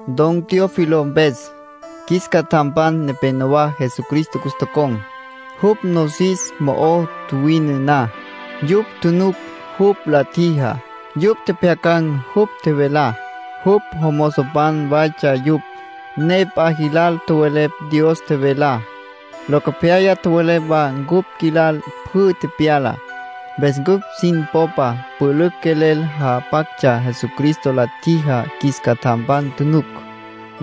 Don Teófilo mpes: Qjuis catjampan nepénowa Jesucristo cus tocon̈, jupj nosis mo'o tjuwine na. Yupj tjunuc jupj la tjijá. Yupj tjepjyacan̈ jupj tjevelá. Jupj jomozopan waytsja yupj, ne p'a jilal tjowelepj Dios tjevelá. Locopyaya tjowelepj wa cupj qjuilal pjü tepyalá. Mpes cupj sin popa pülücj quelel japactsja Jesucristo la tjijá qjuis catjampan tjunuc.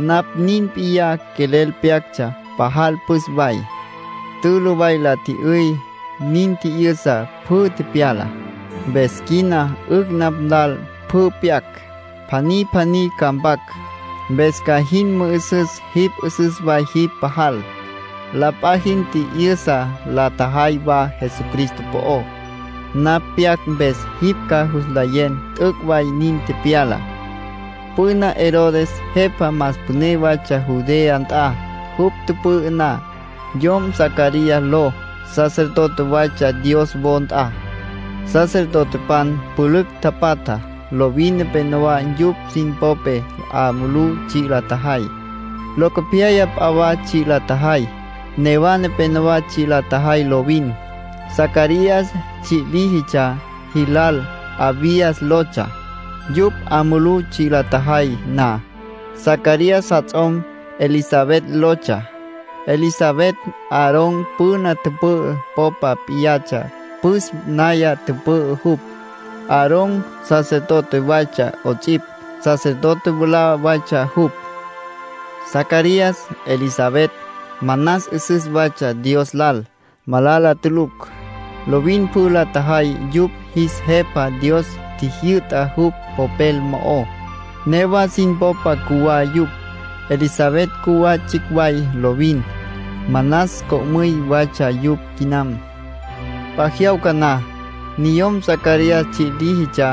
Napj nin p'iyá quelel pyactsja. Pajal püs way, tülü way la tji'yüy, nin tji'yüsa pjü tepyalá. Mpes quina 'ücj napj lal pjü pyac. Pjaní pjaní ca mpac, mpes ca jin mü'üsüs jipj. 'Üsüs way jipj pajal. La p'a jin tji'yüsa la tjajay wa Jesucristo po'ó; napj pyac mpes jipj ca jus nlayen t'üc' way nin tepyala. Püna Herodes jepa más püné waytsja Judea nt'a. Jupj tüpü'ü na, yom Zacarías ló sacerdote waytsja Dios wo nt'a. Sacerdotepan pülücj tapatja. Lovin nepénowa yupj sin popé 'a mulú tsji' la tjajay, locopyaya p'a wa tsji' la tjajay. Newa nepénowa tsji' la tjajay lovin. Zacarías tsji' líjitsja jilal Abías lotsja, yupj 'a mulú tsji' la tjajay na. Zacarías jats'om Elisabet lotsja. Elisabet Aarón püna tüpü'ü popa p'iyatsja püs naya tüpü'ü jupj. (Aarón sacerdote waytsja 'ots'ipj. Sacerdote mwalá waytsja jupj.) Zacarías, Elisabet, manas 'üsüs waytsja Dios lal. Malala tulucj. Lovin pjü la tjajay yupj jis Jepa Dios tjijyü'tá jupj Popel mo'ó. Newa sin popa cjuwá yupj. Elisabet cjuwá tsjicj way lovin; manas co'müy waytsja yupj quinam. P'a jyawca na, niyom Zacarías tsji' líjitsja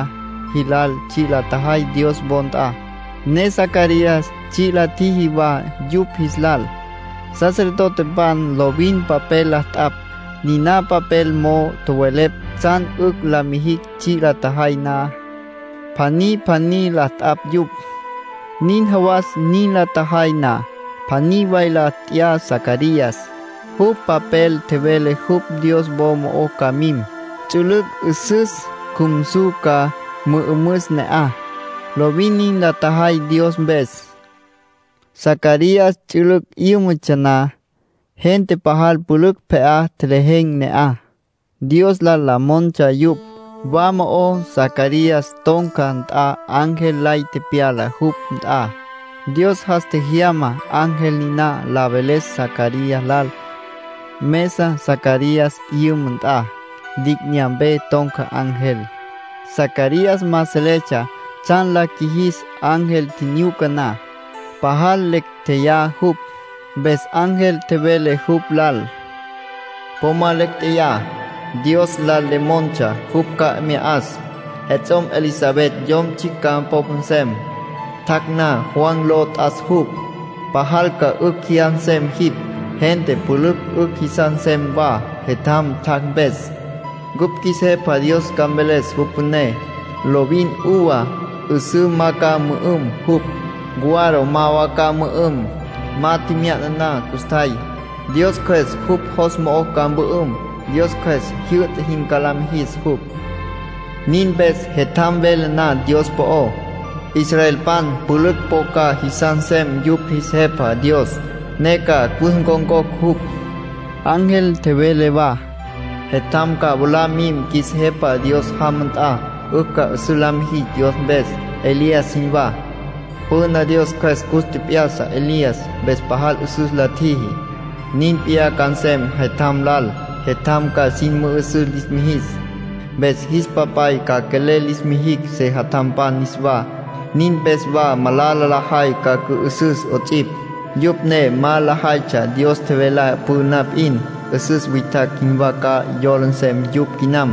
jilal tsji' la tjajay Dios wo nt'a, ne Zacarías tsji' la tjiji wa yupj jis lal. Sacerdotepan lovin papel la t'apj, niná papel mo'ó tjowelepj tsjan 'ücj la mijicj tsji' la tjajay na. Pjaní pjaní la t'apj yupj. Nin jawas nin la tjajay na, pjaní way la t'ya Zacarías. Jupj papel tjevele jupj Dios wo mo'ó ca mim, ts'ülüc' 'üsüs cjumsu ca mü'ümüs ne'aj. Lovin nin la tjajay Dios mpes. Zacarías ts'ülüc' 'yǘmatsja na, gente pajal pülücj pje'á tjelejen̈ ne'aj. Dios lal la montsja yupj. Wa mo'ó Zacarías ton̈ca nt'a ángel lay tepyala jupj nt'a. Dios jas tjejyama ángel niná la veles Zacarías lal. Mesa Zacarías 'yüma nt'a, li'inyampe ton̈ca ángel. Zacarías ma seletsja tsjan la qjuijis ángel tjinyuca na. Pajal lecj tjeyá jupj. Mpes ángel tjevele jupj lal: —Po ma lecj tjeyá. Dios lal le montsja jupj ca mya 'as. Jets'om Elisabet yom tsjicj ca popa nsem. Tjac' na, Juan ló nt'as jupj. Pajal ca 'ücj jyas nsem jipj; gente pülücj 'ücj jisas nsem wa jetjam tjac' mpes. Cupj qjuis Jepa Dios ca mveles jupj püné. Lovin uva 'üsǘ ma ca mü'üm jupj, guaro ma wa ca mü'üm. Ma tjemya'na na custjay, Dios Cjües jupj jos mo'o ca mpü'üm. Dios Cjües jyü'ta jin ca la mijis jupj. Nin mpes jetjam vele na Dios po'ó, israelpan pülücj po ca jisas nsem yupj jis Jepa Dios, ne ca cus ncon̈cocj jupj. Ángel tjevele wa: —Jetjam ca mwalá mim qjuis Jepa Dios jama nt'a. 'Ücj ca 'üsüs la mijis Dios mpes, Elías jinwá. Püna Dios Cjües cus tjep'ya'sa Elías, mpes pajal 'üsüs la tjiji. Nin p'iyá ca nsem jetjam lal. Jetjam ca sin mü'üsüs lis mijis, mpes jis papay ca quelel lis mijicj sejatjampan niswá. Nin mpes wa malala lajay ca cü'ü'süs 'ots'ipj. Yupj ne ma lajaytsja Dios tjevelá püna p'in. 'Üsüs witjacj jinwá ca yola nsem yupj quinam.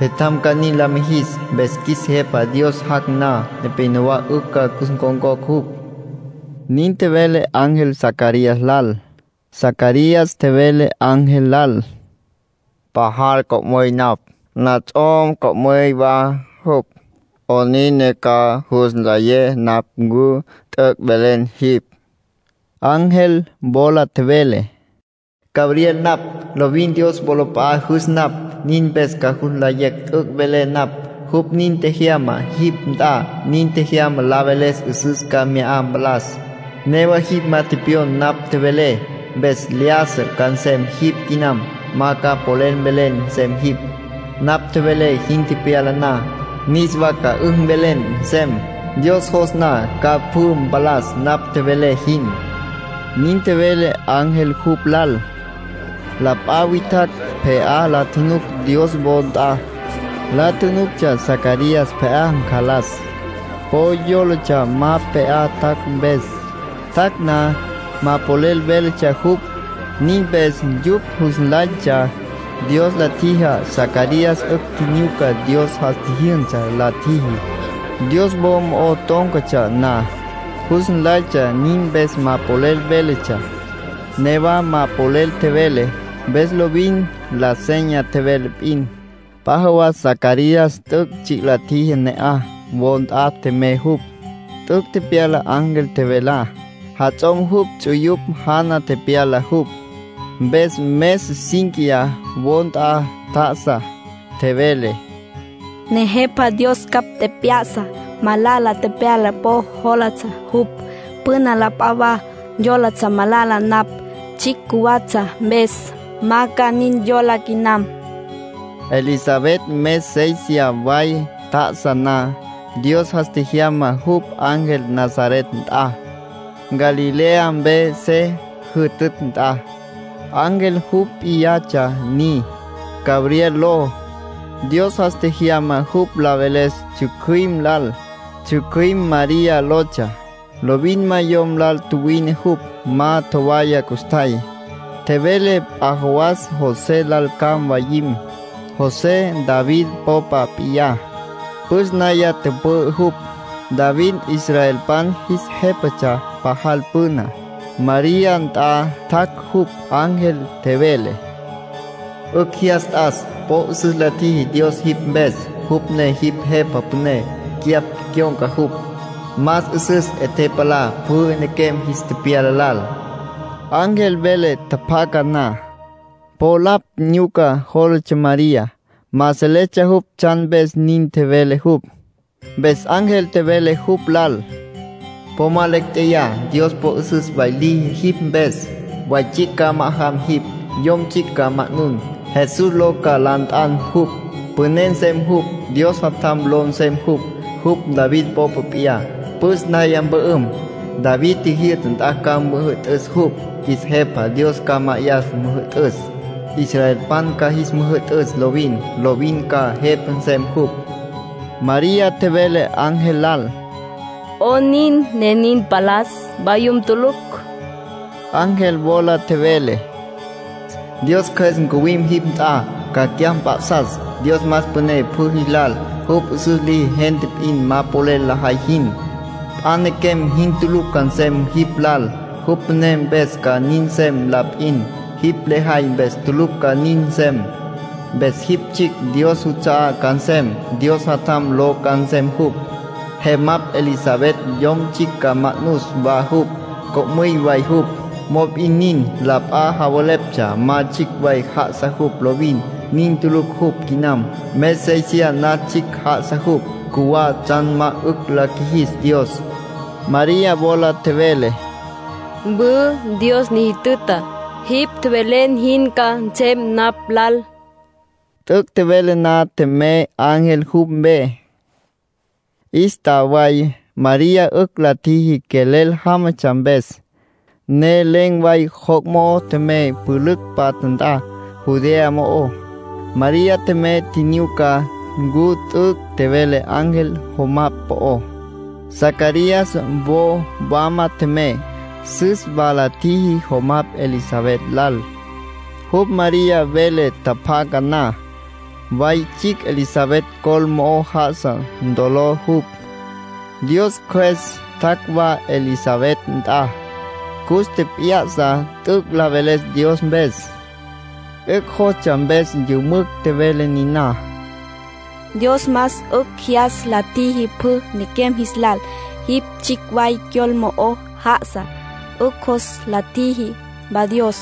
Jetjam ca nin la mijis. Mpes qjuis Jepa Dios jac' na, nepénowa 'ücj ca cus ncon̈cocj jupj —nin tjevele ángel Zacarías lal. Zacarías tjevele ángel lal: —Pajal co'müy napj. Nats'om co'müy wa jupj. ¿'Onin ne ca jus nley napj ncu t'üc' velen jipj? Ángel wola tjevele: —Gabriel napj. Lovin Dios wolap'a'a jüs napj, nin mpes ca jus nlayen t'üc' velé napj. Jupj nin tjejyama jipj nt'a. Nin tjejyama la veles 'üsüs ca mya palas. Newa jipj ma tepyon napj tjevelé, mpes lyájasa ca nsem jipj quinam. Ma ca polel mvelen nsem jipj. Napj tjevelé jin tepyala na, niswa ca 'ücj mvelen nsem. Dios jos na ca pjü mpalas napj tjevelé jin —nin tjevele ángel jupj lal. La p'a witjacj pje'á la tjunuc Dios wo nt'a. La tjunuctsja Zacarías pje'á ncalas. Po yólatsja ma pje'á tjac' mpes. Tjac' na, ma polel véletsja jupj. Nin mpes yupj jus nlaytsja Dios la tjiji Zacarías 'ücj tjinyuca Dios jas tji'yüsa la tjiji, Dios wo mo'ó tón̈catsja na. Jus nlaytsja nin mpes ma polel véletsja. Newa ma polel tjevele, mpes lovin la seña tjevele p'in. P'a jawas Zacarías t'üc' tsji' la tjiji ne'aj. Wo nt'a tjemey jupj. T'üc' tepyala ángel tjevelá. Jats'om jupj ts'uyupj jana tepyala jupj, mpes mes cínquiya wo nt'a tjá'asa. Tjevele: “Nejepa Dios ncapj tjep'ya'sa. Malala ntepalá po jólatsja jupj. Püna la p'a wa yólatsja malala napj, tsjicj cjuwatsja mpes. Ma ca nin yola quinam.” Elisabet mes séisiya way tjá'asa na, Dios jas tjejyama jupj ángel Nazaret nt'a, Galilea mpe se jütütj nt'a. Ángel jupj p'iyatsja ni, Gabriel ló. Dios jas tjejyama jupj la veles tsjücjüim lal. Tsjücjüim María lotsja. Lovin ma yom lal tjuwine jupj. Ma tjowaya custjay. Tjevele p'a jawas José lal ca mwayim. José David popa p'iyá, püs naya tüpü'ü jupj. (David israelpan jis jépatsja pajal püna.) María nt'a tjac' jupj, ángel. Tjevele: —¡'Ücj jyas t'as! Po 'üsüs la tjiji Dios jipj mpes, jupj ne jipj Jepa Püné. Cyapj cyon̈ca jupj. Más 'üsüs 'e tepalá pjü nequem jis tepyala lal. Ángel vele tjapjaca na, po lapj nyuca jólatsja María. Ma seletsja jupj tsjan mpes nin tjevele jupj. Mpes ángel tjevele jupj lal: —¡Po ma lecj tjeyá! Dios po 'üsüs way liji jipj mpes. Way tsjicj ca ma'ajam jipj. Yom tsjicj ca ma'nun. Jesús ló ca la nt'an jupj. Püné nsem jupj. Dios Jatjam ló nsem jupj. Jupj David popa p'iyá, püs naya mpü'üm. David tjijyü'ta nt'a ca müjü'tüs jupj. Qjuis Jepa Dios ca ma'ayas müjü'tüs. Israelpan ca jis müjü'tüs lovin. Lovin ca Jepa nsem jupj. María tjevele ángel lal: —¿'Onin ne nin mpalas? Mvayum tulucj. Ángel wola tjevele: —Dios Cjües ncuwim jipj nt'a, ca cyapj mp'a'sas. Dios más püné pjü jis lal. Jupj 'üsüs liji gente p'in ma polel lajay jin. P'a nequem jin tulucj ca nsem jipj lal. Jupj püné mpes ca nin nsem la p'in. Jipj lejay mpes tulucj ca nin nsem. Mpes jipj tsjicj Dios juts'a'á ca nsem. Dios Jatjam ló ca nsem jupj. ”Jemapj Elisabet yom tsjicj ca ma'nus wa jupj. Co'müy way jupj, mop'in nin. La p'a javeleptsja ma tsjicj way já'asa jupj lovin; nin tulucj jupj quinam. Mes séisiya nas tsjicj já'asa jupj. Cjuwá tsjan ma 'ücj la qjuijis Dios. María wola tjevele: —Mwü. Dios ni jütüta. Jipj tjevelen jin ca nsem napj lal. T'üc' tjevele na tjemey ángel jupj mpe. 'Ístaway María 'ücj la tjiji quelel jámatsja mpes, ne len̈ way joc' mo'o tjemey pülücj patja nt'a, Judea mo'ó. María tjemey tjinyuca ncu t'üc' tjevele ángel jomapj po'ó. Zacarías wo wama tjemey. Süs wa la tjiji jomapj Elisabet lal. Jupj María vele tjapjaca na, way tsjicj Elisabet col mo'o já'asa ntolo jupj. Dios Cjües tjac' wa Elisabet nt'a, cus tjep'ya'sa t'üc' la veles Dios mpes. 'Ücj jostsja mpes yümücj tjevele niná: —Dios más 'ücj jyas la tjiji pjü nequem jis lal. Jipj tsjicj way cyol mo'o já'asa 'ücj jos la tjiji wa Dios.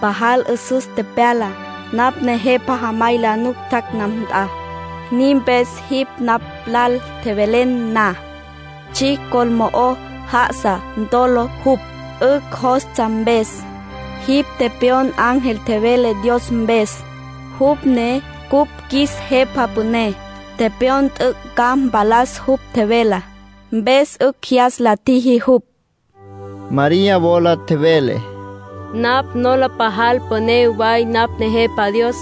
Pajal 'üsüs ntepalá, napj Nejepa jamay la nuc tjac' napj nt'a. Nin mpes jipj napj lal tjevelen na, tsjicj ncol mo'o já'asa ntolo jupj, 'ücj jostsja mpes. Jipj tepyon ángel tjevelá Dios mpes, jupj ne cupj qjuis Jepa Püné. Tepyon t'üc' ca mpalas jupj tjevelá, mpes 'ücj jyas la tjiji jupj. María wola tjevele: “Napj nola pajal püné way napj Nejepa Dios.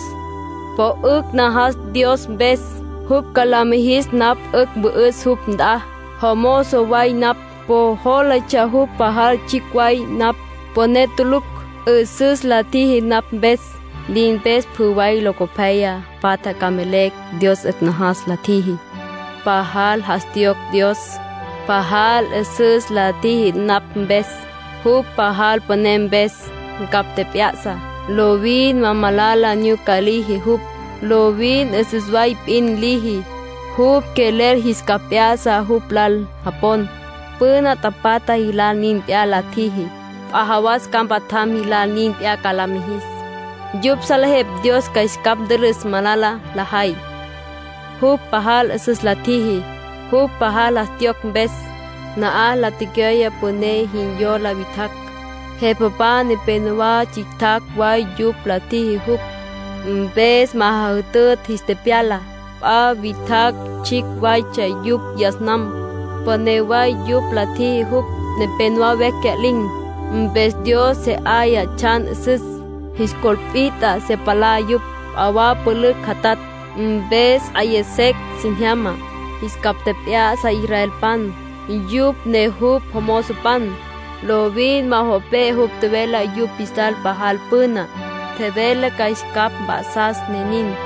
Po 'ücj najas Dios mpes. Jupj ca la mijis napj 'ücj ca mpü'üs jupj nt'a. Jomozo way napj. Po jólatsja jupj pajal tsjicj way napj, püné tulucj. 'Üsüs la tjiji napj mpes. Nin mpes pjü way locopyaya patja ca mvelecj Dios 'ücj najas la tjiji. Pajal jas tjiyocj Dios. Pajal 'üsüs la tjiji napj mpes, jupj pajal püné mpes. Ncapj tjep'ya'sa. Lovin ma malala nyuca liji jupj. Lovin 'üsüs way p'in liji. Jupj quelel jis capj p'ya'sa jupj lal japon. Püna tapatja jilal nin p'iyá la tjiji, p'a jawas ca mpatjam jilal nin p'iyá ca la mijis. Yupj salejepj Dios ca jis capj ntülüs malala lajay. Jupj pajal 'üsüs la tjiji, jupj pajal jas tjiyocj mpes. Na'aj la tecyoye püné jin yola witjacj. Jepapan nepénowa tsjicj way yupj la tjiji jupj, mpes ma jajütütj jis tepyala. P'a witjacj tsjicj waytsja yupj yas nam, püné way yupj la tjiji jupj. Nepénowa vecj cya'lin̈, mpes Dios se 'aya tsjan 'üsüs. Jis col pit'a se palá yupj. P'a wa pülücj jatatj, mpes 'aya secj sin jyama. Jis capj tjep'ya'sa israelpan, yupj ne jupj jomozopan. Lovin ma jo' pe'e jupj tjevelá yupj jis lal pajal püna. Tjevele ca jis capj mp'a'sas, ne nin.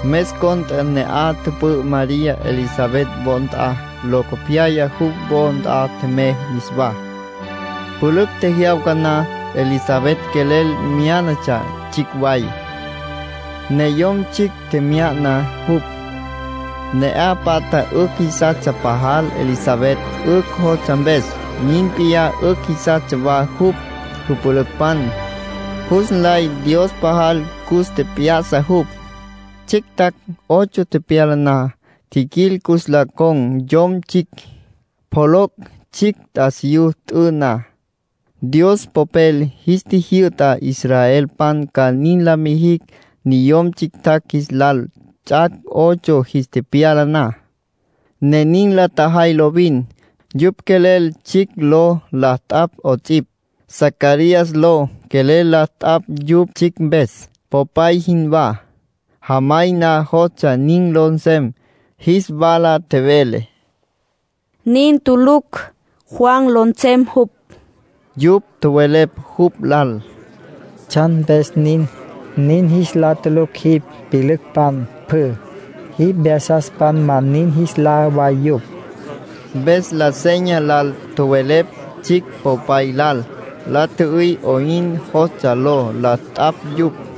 Mes cont'e ne'aj tüpü'ü María Elisabet wo nt'a. Locopyaya jupj wo nt'a tjemey niswá. Pülücj tjejyawca na Elisabet quelel myá'natsja tsjicj way, ne yom tsjicj tjemya'na jupj. Ne'aj patja 'ücj jisastsja pajal Elisabet 'ücj jostsja mpes. Nin p'iyá 'ücj jisastsja wa jupj jüpülücpan. Jus nlay Dios pajal cus tjep'ya'sa jupj. Tsjicj ts'ac' ocho tepyala na, tjiquil cus la con̈ yom tsjicj, pjoloc' tsjicj t'asiyú t'ü na. Dios Popel jis tjijyü'ta israelpan ca nin la mijicj niyom tsjictjacj jis lal ts'ac' ocho jis tepyala na, ne nin la tjajay lovin. Yupj quelel tsjicj ló la t'apj 'ots'ipj. Zacarías ló quelel la t'apj yupj tsjicj mpes, popay jinwá. Jamay ma jostsja nin ló nsem. Jis wala tjevele: —Nin tulucj. Juan ló nsem jupj. Yupj tjowelepj jupj lal: —¿Tsjan mpes nin? Nin jis lá tulucj jipj pyülücpan pjü, jipj vyasaspan ma nin jis lá way yupj. Mpes la seña lal tjowelepj tsjicj popay lal. La tjü'üy 'oyn jostsja ló la t'apj yupj.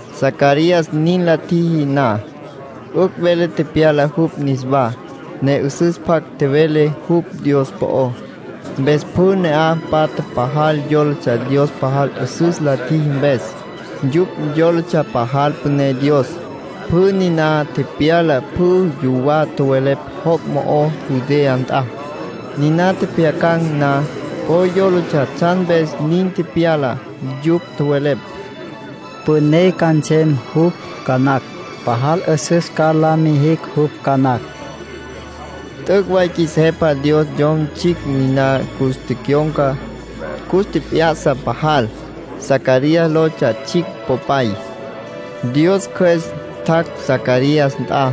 Zacarías nin la tjiji na, 'ücj vele tepyala jupj niswá, ne 'üsüs pjac tjevele jupj Dios po'ó. Mpes pjü ne'aj patja pajal yólatsja Dios pajal 'üsüs la tjiji mpes; yupj yólatsja pajal püné Dios. Pjü niná tepyalá pjü yuwá tjowelepj joc' mo'ó Judea nt'a. Niná tjepjyacan̈ na, po yólatsja tsjan mpes nin tepyala. Yupj tjowelepj: “Püné ca nsem jupj ca nacj. Pajal 'üsüs ca la mijis jupj ca nacj.” T'üc' way qjuis Jepa Dios yom tsjicj niná cus tecyon̈ca, cus tjep'ya'sa pajal. Zacarías lotsja tsjicj popay. Dios Cjües tjac' Zacarías nt'a,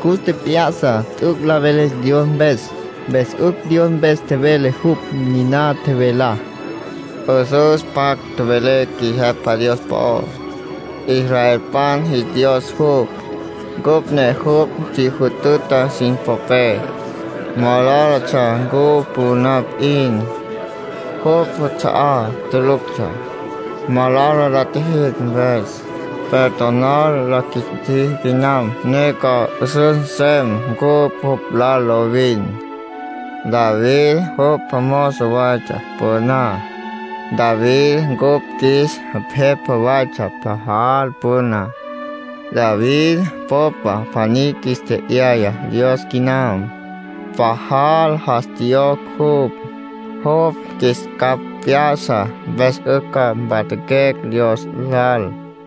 cus tjep'ya'sa t'üc' la veles Dios mpes. Mpes 'ücj Dios mpes tjevele jupj. Niná tjevelá: “'Üsüs pjac tjowelé qjuis Jepa Dios po'ó. Israelpan jis Dios jupj. Cupj ne jupj si jütüta sin popé. Malálatsja cupj püna p'in, jupj juts'a'á tuluctsja, malala la tjijicj mpes. Perdonar la qjuis tjiji quinam, ne ca 'üsüs nsem cupj jupj lal lovin. David jupj jomozo waytsja püná. David ncupj qjuis jepa waytsja pajal püna. David popa pjaní qjuis tje'yaya Dios quinam. Pajal jas tjiyocj jupj. Jupj qjuis capj p'ya'sa, mpes 'ücj ca mpatjaquecj Dios lal.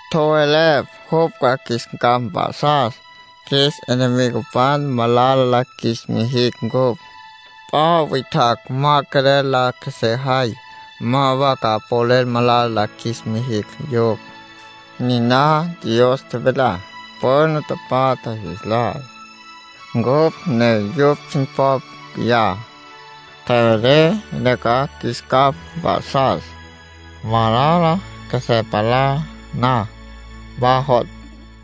Tjowelepj jupj ca qjuis capj mp'a'sas, qjuis enemigopan ma malala la qjuis mijicj ncupj. P'a witjacj ma quelel la qjuesejay, ma wa ca polel malala la qjuis mijicj yupj. Niná Dios tjevelá püna tapatja jis lal, cupj ne yupj sin popa p'iyá. Tjevele ca qjuis capj mp'a'sas, malala qjuesé palá na. Ma jo'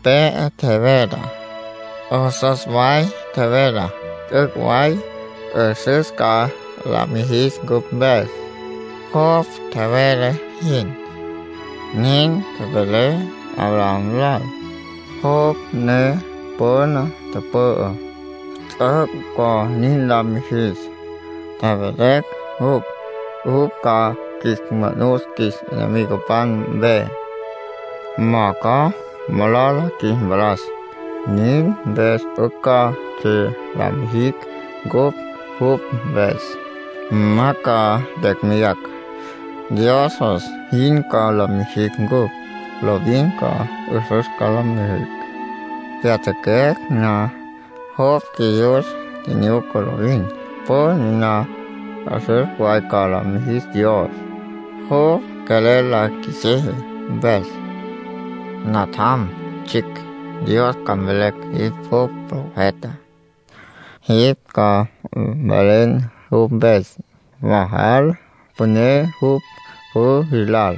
tepe'e tjevelá. 'Üsüs way tjevelá, t'üc' way 'üsüs ca la mijis cupj mpes, jupj tjevele jin. Nin tjevele Abraham lal, jupj ne püna tüpü'á. T'üc' ca nin la mijis, tjevele jupj. Jupj ca qjuis manus qjuis enemigopan mpe, ma ca malala qjuis mpalas. Nin mpes 'ücj ca tsji' la mijicj cupj jupj mpes. Ma ca lecj meyacj. Dios jos jin ca la mijicj cupj. Lovin 'üsüs ca la mijicj, pyatjaquecj na. Jupj qjuiyus nyuca lovin. Pjü niná 'üsüs way ca la mijis Dios, jupj quelel la qjuisiji mpes. Natjam tsjicj, Dios ca mveles jipj jupj profeta. Jipj ca mvelen jupj mpes. Pajal püné jupj pjü jis lal.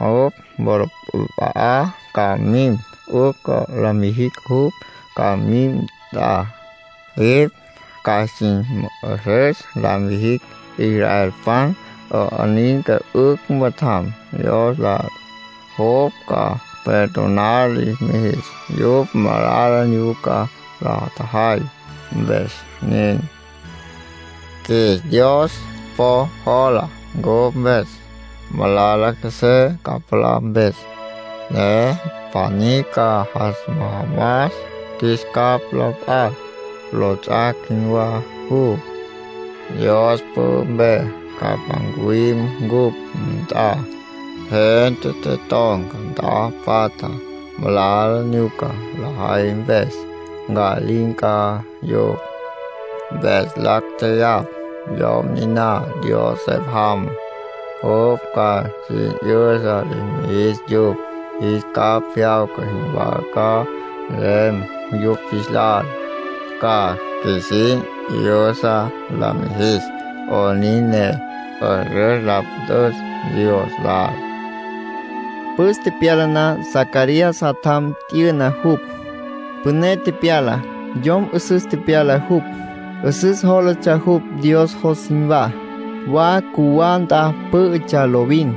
Jupj wolap'a'a ca mim, 'ücj la mijin jupj ca mim nt'a. Jipj ca sin mü'üsüs la mijin israelpan 'onin ne 'ücj mpatjam Dios lal. Jupj ca perdonar lis mijis yupj malala nyuca la tjajay, mpes nin. Qjuis Dios po jola cupj mpes, malala qjuesé palá mpes, ne pjaní ca jas majamas qjuis capj la p'acj. Lots'ac' jinwá jupj. Dios pü'ü mpe ca ncuwim cupj nt'a. Gente te ton̈ca nt'a patja malala nyuca lajay mpes. Nca'lin̈ ca yupj, mpes lacj jeyapj. Yom niná Dios se jamá, jupj ca sin 'yüsa lis mijis yupj. Jis capj jyawca jinwá ca nsem yupj jis lal. Ca qjuisin 'yüsa la mijis 'onin ne 'üsüs la püt'üs Dios lal”, nin tjevele Zacarías. Püs tepyala na Zacarías jatjam t'yüna jupj, püné tepyala. Yom 'üsüs tepyala jupj. 'Üsüs jólatsja jupj Dios jos jinwá. Wa cjuwá nt'a pǘ'ütsja lovin,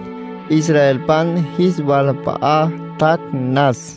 israelpan jis walap'a'a tjac' nas.